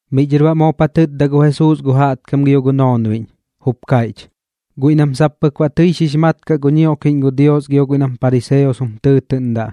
Miꞌ dhɨr baꞌ moop ja tɨtda gu Jesuus gu jaꞌtkam gio gu noonbiꞌñ, jup kaiꞌch: ―Guiꞌ nam sap pɨk baꞌ tɨi xix mat kaꞌ gu ñioꞌkiꞌñ gu Dios gio guiꞌ nam pariseos jum tɨɨtɨꞌndaꞌ,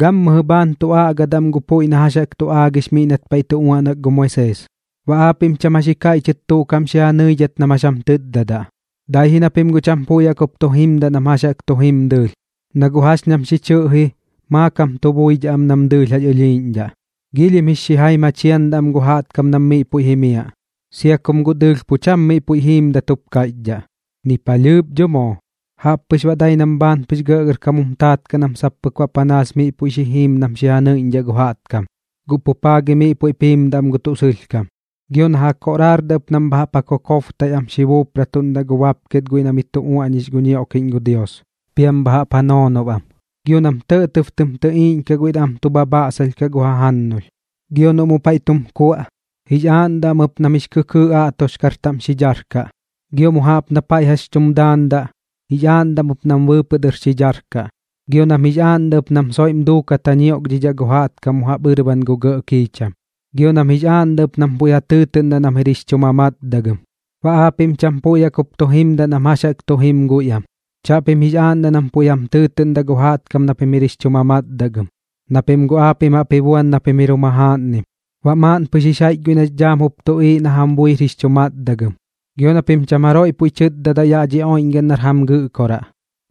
gammɨjɨ bhaan tu aꞌgadaꞌ am gu puiꞌ na jax jaꞌk tu aagix miꞌ nat paiꞌ tu uaꞌnak gu Moisees. Baꞌ aapiꞌm cham jax ji kaiꞌchɨt tuꞌ kaꞌm xi ja nɨidhat nam jax jam tɨtdadaꞌ, dai ji na pim guꞌ cham puiꞌ jaꞌk jup tu jimdaꞌ nam jax jaꞌk tu jim dɨɨlh, na guꞌ jax ñam xi chɨꞌji maakam tu buidhaꞌ am nam dɨɨlh jax ɨlhiiꞌñdhaꞌ. Giilhim jix xijaim ja chiandaꞌ am gu jaꞌtkam nam miꞌ puiꞌ jimiaꞌ, sia kum guꞌ dɨɨlh pu cham miꞌ puiꞌ jiimdat jup kaiꞌchdhaꞌ, ni palhɨɨp dho moo. Jaꞌp pɨx baꞌ dai nam bhaan pɨx gɇꞌgɇrkam jum taat kaꞌ nam sap pɨk baꞌ panaas miꞌ puiꞌ xi jiim nam xi ja nɨiꞌñdhaꞌ gu jaꞌtkam, guꞌ pu paa gi miꞌ puiꞌp jiimdaꞌ am gu tuꞌ sɨlhkam. Gio na ja koꞌraardaꞌ ɨp nam bha jaꞌp ja kokobtaiꞌ am xi ja buupratuꞌndaꞌ gu bapket guiꞌ na miꞌ tu uaꞌñix gu ñioꞌkiꞌñ gu Dios, piam bha jaꞌp ja noonob am. Gio nam tɇꞌtɇb tɨm tɨꞌiiꞌñkaꞌ guiꞌ na am tu bhabhaꞌsalh kaꞌ gu jajannulh. Gio noꞌ mu paiꞌ tum kuaꞌ, jix aaꞌndaꞌ am ɨp nam jix kɨkɨɨꞌ aꞌtoxkar taꞌm xi dharkaꞌ, gio mu jaꞌp na paiꞌ jax tum daandaꞌ, jix aaꞌndaꞌ am ɨp nam bɨɨpɨꞌ dɨr xi dharkaꞌ. Gio nam jix aaꞌndaꞌ ɨp nam soiꞌm duukat ja ñioꞌkiꞌñdhaꞌ gu jaꞌtkam mu jaꞌp ɨrban gu gɇꞌ kiicham, gio nam jix aaꞌndaꞌ ɨp nam puiꞌ ja tɨɨtɨꞌndaꞌ nam jir jix chu mamatdagɨm. ’Baꞌ aapiꞌm cham puiꞌ jaꞌk jup tu jimdaꞌ nam jax jaꞌk tu jim guiꞌam. Chaꞌpim jix aaꞌndaꞌ nam puiꞌ jam tɨɨtɨꞌndaꞌ gu jaꞌtkam na pim jir jix chu mamatdagɨm, na pim guꞌ aapiꞌm jaꞌp ba ji buan na pim jir jum jajaaꞌnnim. Baꞌ maaꞌn pɨx jix jaiꞌch guiꞌ nax dhaam jup tuꞌiiꞌ na jam buir jix chu matdagɨm. Gio na pim cham jaroiꞌ puiꞌ tɨɨtɨꞌndaꞌ yaꞌ dhi oiꞌñgaꞌn nar jam gɨꞌkoraꞌ,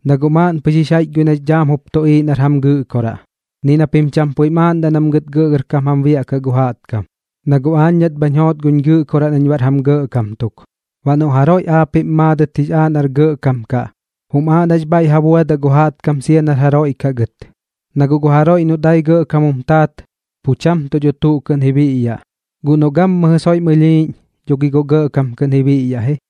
na guꞌ maaꞌn pɨx jix jaiꞌch guiꞌ nax dhaam jup tuꞌiiꞌ nar jam Gɨꞌkoraꞌ. Ni na pim cham puiꞌm aaꞌndaꞌ nam gɨt gɇꞌgɇrkam jam biaꞌkaꞌ gu jaꞌtkam, na guꞌ aañ nat bhañ joot guñ Gɨꞌkoraꞌ nañ baꞌr jam gɇꞌkam tuk. Baꞌ noꞌ jaroiꞌ aapiꞌm maadɨt jix aaꞌ nar gɇꞌkam kaꞌ, jum aaꞌ nax bhaiꞌ ja buadaꞌ gu jaꞌtkam sia nar jaroiꞌ kaꞌ gɨt. Na guꞌ gu jaroiꞌ noꞌ dai gɇꞌkam jum taat, pu cham tuꞌ dho tuꞌ kɨꞌn ji biꞌyaꞌ, guꞌ noꞌ gammɨjɨ soiꞌm ɨlhiiꞌñ, dho gi guꞌ gɇꞌkam kɨꞌn ji biꞌyaꞌ ji.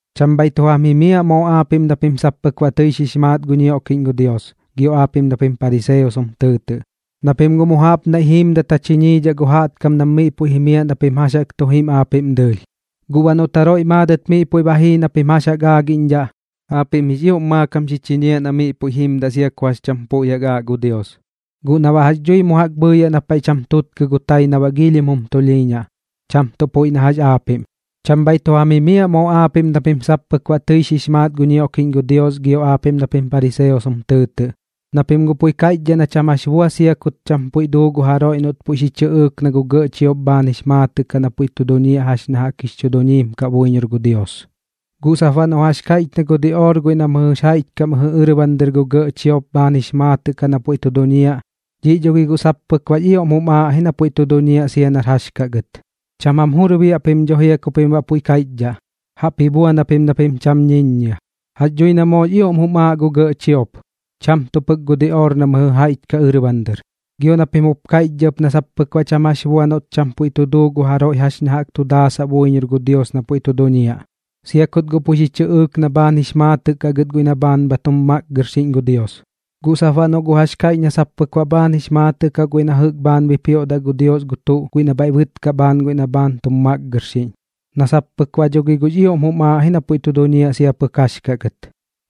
’Cham bhaiꞌ tu jam jimiaꞌ moo aapiꞌm na pim sap pɨk baꞌ tɨi xix maat gu ñioꞌkiꞌñ gu Dios gio aapiꞌm na pim pariseos jum tɨɨtɨꞌ, na pim guꞌ mu jaꞌp naiꞌ jiimdat ja chiñiidhaꞌ gu jaꞌtkam nam miꞌ puiꞌ jimiaꞌ na pim jax jaꞌk tu jim aapiꞌm dɨɨlh. Guꞌ baꞌ noꞌt jaroiꞌ maadɨt miꞌ puiꞌ ba jii na pim jax ja aagiꞌñdhaꞌ, aapiꞌm jix ioꞌm maakam xi chiñiaꞌ na miꞌ puiꞌ jimdaꞌ sia ku jax cham puiꞌ aaꞌ gu Dios, guꞌ na baꞌ jax dhui mu jaꞌk bhɨɨyaꞌ na paiꞌ cham tutkɨ gu tai na baꞌ giilhim jum tulhiiñaꞌ, cham tuꞌ puiꞌ na jax aapiꞌm. ’Cham bhaiꞌ tu jam jimiaꞌ moo aapiꞌm na pim sap pɨk baꞌ tɨi xix maat gu ñioꞌkiꞌñ gu Dios gio aapiꞌm na pim pariseos jum tɨɨtɨꞌ, na pim guꞌ puiꞌ kaiꞌchdhaꞌ na cham jax bua sia kut cham puiꞌ duu gu jaroiꞌ noꞌt puiꞌ xi chɨꞌɨɨk na gu gɇꞌ chiop bhaan jix maatɨꞌ kaꞌ na puiꞌ tu duñiaꞌ jax ña jaꞌk jix chu duñiim kaꞌ buiñor gu Dios. Guꞌ sap baꞌ noꞌ jax kaiꞌch na gu diꞌoor guiꞌ na mɨjɨ jaiꞌch kaꞌ mɨjɨ ɨrban dɨr gu gɇꞌ chiop bhaan jix maatɨꞌ kaꞌ na puiꞌ tu duñiaꞌ, dhiꞌ dho gi guꞌ sap pɨk baꞌx ioꞌm jum aaꞌ ji na puiꞌ tu duñiaꞌ sia nar jax kaꞌ gɨt. Cham jam jur biaꞌ pim dho jia ku pim baꞌ puiꞌ kaiꞌchdhaꞌ, jaꞌp ji buan japim na pim cham ñiññia. Jax dhui na moox ioꞌm jum aaꞌ gu gɇꞌ chiop, cham tuꞌ pɨx gu diꞌoor na mɨjɨ jaiꞌch kaꞌ ɨrban dɨr. Gio na pim jup kaiꞌchdhaꞌ ɨp na sap pɨk baꞌ cham jax bua noꞌt cham puiꞌ tu duu gu jaroiꞌ jax ña jaꞌk tu daasaꞌ buiñor gu Dios na pu tu duñiaꞌ, sia kut guꞌ puiꞌ xi chɨꞌɨɨk na bhaan jix maatɨꞌ kaꞌ gɨt guiꞌ na bhaan bha tum makgɨrxiꞌñ gu Dios. Guꞌ sap baꞌ noꞌ guꞌ jax kaiꞌch na sap pɨk baꞌ bhaan jix maatɨꞌ kaꞌ guiꞌ na jɨꞌk bhaan bipioꞌdaꞌ gu Dios gu tuꞌ guiꞌ na bhaiꞌ bɨtkaꞌ bhaan guiꞌ na bha tum makgɨrxiꞌñ, na sap pɨk baꞌ dho gi guꞌx ioꞌm jum aaꞌ ji na pu duñiaꞌ sia nar jax kaꞌ gɨt.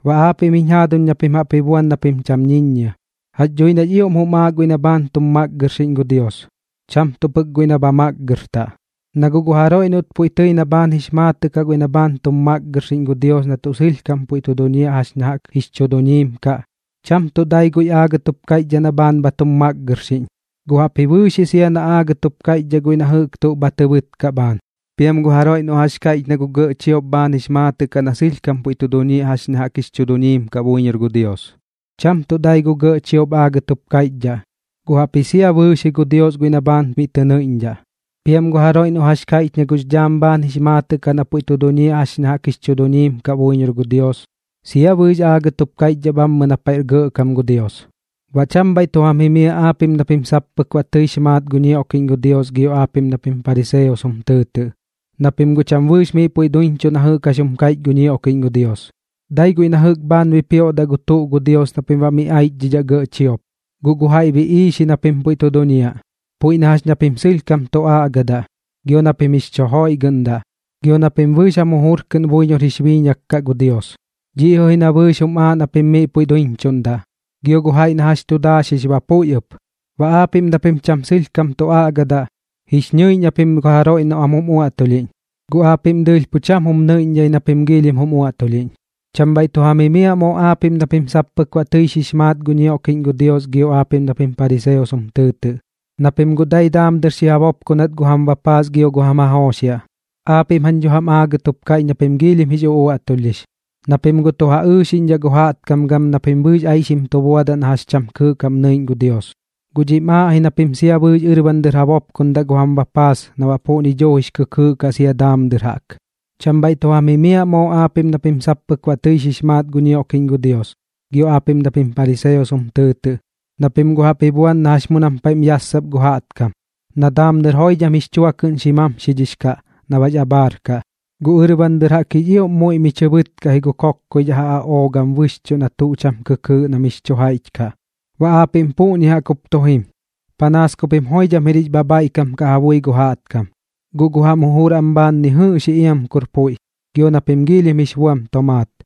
Baꞌ aapiꞌm jiñ jaaduñ na pim jaꞌp ji buan na pim cham ñiññia, jax dhui nax ioꞌm jum aaꞌ guiꞌ na bhaan bha tum makgɨrxiꞌñ gu Dios, cham tuꞌ pɨk guiꞌ nam bha makgɨrtaꞌ. Na guꞌ gu jaroiꞌ noꞌt puiꞌ tɨi na bhaan jix maatɨꞌ kaꞌ guiꞌ na bhaan tum makgɨrxiꞌñ gu Dios na tuꞌ sɨlhkam puiꞌ tu duñiaꞌ jax ña jaꞌk jix chu duñiim kaꞌ, cham tuꞌ dai guiꞌ aagɨt jup kaiꞌchdhaꞌ na bhaan bha tum makgɨrxiꞌñ, guꞌ jaꞌpji bɨɨx ji sia na aagɨt jup kaiꞌchdhaꞌ guiꞌ na jɨꞌk tuꞌ bha tɨ bɨtkaꞌ bhaan. Piam gu jaroiꞌ noꞌ jax kaiꞌch na gu gɇꞌ chiop bhaan jix maatɨꞌ kaꞌ na sɨlhkam puiꞌ tu duñiaꞌ jax ña jaꞌk jix chu duñiim kaꞌ buiñor gu Dios, cham tuꞌ dai gu gɇꞌ chiop aagɨt jup kaiꞌchdhaꞌ, guꞌ jaꞌpji sia bɨɨx ji gu Dios guiꞌ na bhaan miꞌ tɨ nɨiꞌñdhaꞌ. Piam gu jaroiꞌ noꞌ jax kaiꞌch na gux dhaam bhaan jix maatɨꞌ kaꞌ na puiꞌ tu duñiaꞌ jax ña jaꞌk jix chu duñiim kaꞌ buiñor gu Dios, sia bɨɨx aagɨt jup kaiꞌchdhaꞌ bhammɨ na paiꞌr gɇꞌkam gu Dios. ’Baꞌ cham bhaiꞌ tu jam jimiaꞌ aapiꞌm na pim sap pɨk baꞌ tɨix maat gu ñioꞌkiꞌñ gu Dios gio aapiꞌm na pim pariseos jum tɨɨtɨꞌ, na pim guꞌ cham bɨɨx miꞌ puiꞌ duiñchuꞌ na jɨꞌk jax jum kaiꞌch gu ñioꞌkiꞌñ gu Dios, dai guiꞌ na jɨꞌk bhaan bipioꞌdaꞌ gu tuꞌ gu Dios na pim baꞌ miꞌ aichdhidhaꞌ gɇꞌ chiop. Guꞌ gu jaiꞌ biꞌiix ji na pim pu duñiaꞌ, puiꞌ na jax na pim sɨlhkam tu aꞌgadaꞌ, gio na pim jix chu joiꞌgɨꞌndaꞌ, gio na pim bɨɨx jam jujur kɨꞌn buiñor jix biiñak kaꞌ gu Dios. Dhiꞌ jɨꞌ ji na bɨɨx jum aaꞌ na pim miꞌ puiꞌ duiñchuꞌndaꞌ, gio gu jaiꞌ na jax tu daaxix ba puiꞌ ɨp. Baꞌ aapiꞌm na pim cham sɨlhkam tu aꞌgadaꞌ, jix ñɨiꞌñ japim gu jaroiꞌ noꞌ am jum uaꞌtulhiꞌñ, guꞌ aapiꞌm dɨɨlh pu cham jum nɨiꞌñdhaꞌ na pim giilhim jum uaꞌtulhiꞌñ. ’Cham bhaiꞌ tu jam jimiaꞌ moo aapiꞌm na pim sap pɨk baꞌ tɨi xix maat gu ñioꞌkiꞌñ gu Dios gio aapiꞌm na pim pariseos jum tɨɨtɨꞌ, na pim guꞌ dai daam dɨr xi ja bopkonat gu jam bapaas gio gu jam jajooxiaꞌ. Aapiꞌm jañ dho jam aagɨt jup kaiꞌch na pim giilhim jix uꞌuaꞌtulhdhix, na pim guꞌ tu ja ɨɨxiꞌñdhaꞌ gu jaꞌtkam gam na pim bɨɨx aixim tu buadaꞌ na jax cham kɨɨꞌ kaꞌm nɨiꞌñ gu Dios. Guꞌ dhiꞌm aaꞌ ji na pim sia bɨɨx ɨrban dɨr jaꞌk ja bopkondaꞌ gu jam bapaas na baꞌ puꞌñi jaꞌk jix kɨkɨɨꞌ kaꞌ sia daam dɨr jaꞌk. ’Cham bhaiꞌ tu jam jimiaꞌ moo aapiꞌm na pim sap pɨk baꞌ tɨi xix maat gu ñioꞌkiꞌñ gu Dios gio aapiꞌm na pim pariseos jum tɨɨtɨꞌ, na pim guꞌ jaꞌp ji buan na jax mu nam paiꞌm yassap gu jaꞌtkam, na daam dɨr joidham jix chua kɨꞌn xi mamxidhix kaꞌ na baꞌx abhaar kaꞌ, guꞌ ɨrban dɨr jaꞌk jix ioꞌm muiꞌ mi chɨ bɨtkaꞌ ji gu kokkoidhaꞌ ja aꞌoo gam bɨxchuꞌ gu tuꞌ na cham kɨkɨɨꞌ na mix chu jaiꞌch kaꞌ. Baꞌ aapiꞌm puꞌñi jaꞌk jup tu jim, panaas ku pim joidham jir jix bhabhaiꞌkam kaꞌ ja bui gu jaꞌtkam, guꞌ gu jam jujur am bhaan ni jɨꞌx ji iam kur puiꞌ, gio na pim giilhim jix buam tomaat.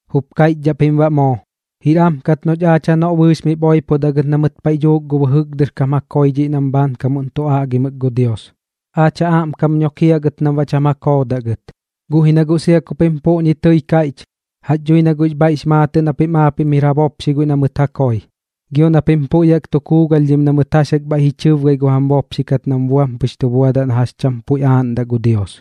Jup kaiꞌchdhaꞌ pim baꞌ moo: “Jir am kat noꞌch gɨt aach janoꞌ bɨɨx miꞌp oipodaꞌ gɨt na mɨt paiꞌ dhuuk gu bɨjɨk dɨr kam ja koi dhiꞌ nam bhaankamuꞌn tu aꞌgimɨk gu Dios. Aach ja aꞌmkam nokiaꞌ gɨt ji nam baꞌ cham ja koodaꞌ gɨt.” Guꞌ ji na guꞌ sia ku pim puꞌñi tɨi kaiꞌch, jax dhui na guꞌx bhaiꞌx maatɨꞌ na pim aapiꞌm jir ja bopxi guiꞌ na mɨt ja koi, gio na pim puiꞌ jaꞌk tu kuugalhdhim na mɨt jax jaꞌk bhaiꞌ ji chɨbgai gu jam bopxi kat nam buam pɨx tu buadaꞌ na jax cham puiꞌ aaꞌndaꞌ gu Dios.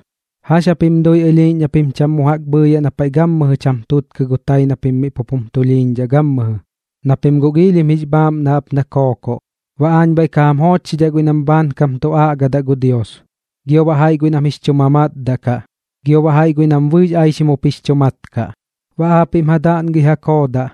’¿Jax japim dui ɨlhiiꞌñ na pim cham mu jaꞌk bhɨɨyaꞌ na paiꞌ gammɨjɨ cham tutkɨ gu tai na pim miꞌ pup jum tulhiiñdhaꞌ gammɨjɨ? Na pim guꞌ giilhim jix bhaaꞌmnaꞌ jaꞌp na kookoꞌ. Baꞌ aañ bhaiꞌ ka jam joochxidhaꞌ guiꞌ nam bhaankam tu aꞌgadaꞌ gu Dios, gio baꞌ jaiꞌ guiꞌ nam jix chu mamatdaꞌ kaꞌ, gio baꞌ jaiꞌ guiꞌ nam bɨɨx aixim jup jix chu mat kaꞌ. Baꞌ aapiꞌm ja daꞌngɨi ja koodaꞌ,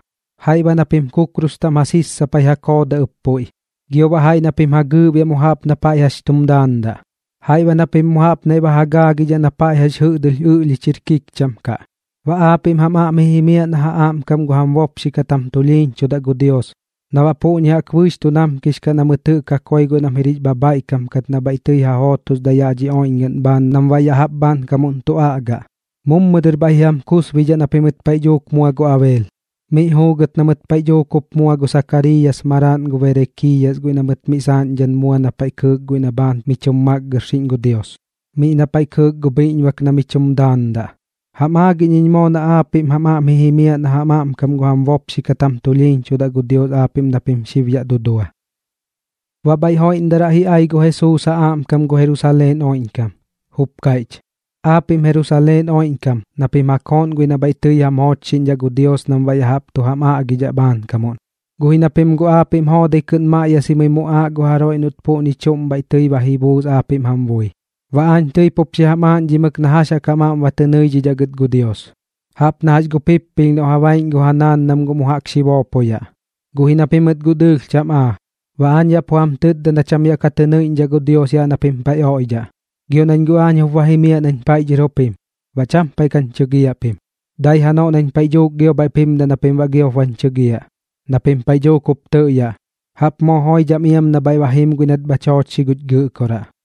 jaiꞌ baꞌ na pim kukrus taꞌm ja sissapai ja koodaꞌ ɨp puiꞌ, gio baꞌ jaiꞌ na pim ja gɨɨꞌbiaꞌ mu jaꞌp na paiꞌ jax tum daandaꞌ, jaiꞌ baꞌ na pim mu jaꞌp naiꞌ ba ja gaagidhaꞌ na paiꞌ jax jɨꞌdɨlh ɨꞌlhich jir kikcham kaꞌ. Baꞌ aapiꞌm jam aꞌm ji jimiaꞌ na ja aꞌmkam gu jam bopxi kat jam tulhiiñchudaꞌ gu Dios, na baꞌ puꞌñi jaꞌk bɨɨx tu namkix kaꞌ na mɨt jɨꞌk ja koi guiꞌ nam jir jix bhabhaiꞌkam kat na bhaiꞌ tɨi ja jootosdaꞌ yaꞌ dhi oiꞌñgaꞌn bhaan nam baꞌ ya jaꞌp bhaankam tu aꞌgaꞌ. Mummɨ dɨr bhaiꞌ ji jam kusbidhaꞌ na mɨt paiꞌ dhuuk mua gu Abeel, miꞌ juugɨt na mɨt paiꞌ dhuuk jup mua gu Sakariiyas maraaꞌn gu Berekiiyas guiꞌ na mɨt miꞌ saaꞌñdhan mua na paiꞌ kɨɨk guiꞌ na bhaan mi chum makgɨrxiꞌñ gu Dios, miꞌ na paiꞌ kɨɨk gu bhiꞌñbak na mi chum daandaꞌ. Jam aagiꞌñ iñ moo na aapiꞌm jam aꞌm ji jimiaꞌ na ja aꞌmkam gu jam bopxi kat jam tulhiiñchudaꞌ gu Dios aapiꞌm na pim xib yaꞌ dudua. Baꞌ bhaiꞌ joiꞌmdaraꞌ ji ai gu Jesuus ja aꞌmkam gu Jerusaleen oiꞌñkam, jup kaiꞌch: ―Aapiꞌm Jerusaleen oiꞌñkam na pim ja kooꞌn guiꞌ na bhaiꞌ tɨi jam joochxiꞌñdhaꞌ gu Dios nam baꞌ ya jaꞌp tu jam aꞌgidhaꞌ bhaankamuꞌn, guꞌ ji na pim guꞌ aapiꞌm joodai kɨꞌn maꞌyasimɨi muꞌaaꞌ gu jaroiꞌ noꞌt puꞌñi chuꞌm bhaiꞌ tɨi ba ji buus aapiꞌm jam bui. Baꞌ aañ tɨi pup xi jam aaꞌñdhimɨk na jax jaꞌk jam aꞌm ba tɨ nɨidhidhaꞌ gɨt gu Dios, jaꞌp na jax gu pippilh noꞌ ja baiꞌñ gu ja naan nam mu jaꞌk xi boopoyaꞌ, guꞌ ji na pimɨt guꞌ dɨɨlh cham aa. Baꞌ aañ yaꞌ pu jam tɨtda na cham yaꞌ ka tɨ nɨiꞌñdhaꞌ gu Dios yaꞌ na pim paiꞌ oiꞌdhaꞌ. Gio nañ guꞌ aañ jup ba jimiaꞌ nañ paiꞌ dhɨr jup jim, baꞌ cham paiꞌ kañ chɨgiaꞌ pim. Dai janoꞌ nañ paiꞌ dhuuk gio bhaiꞌp jimdaꞌ na pim baꞌ giop bañ chɨgiaꞌ, na pim paiꞌ dhuuk jup tɨꞌyaꞌ: “Jaꞌp moo joidham iam na bhaiꞌ ba jim guiꞌ nat bhach joochxi guch Gɨꞌkoraꞌ.”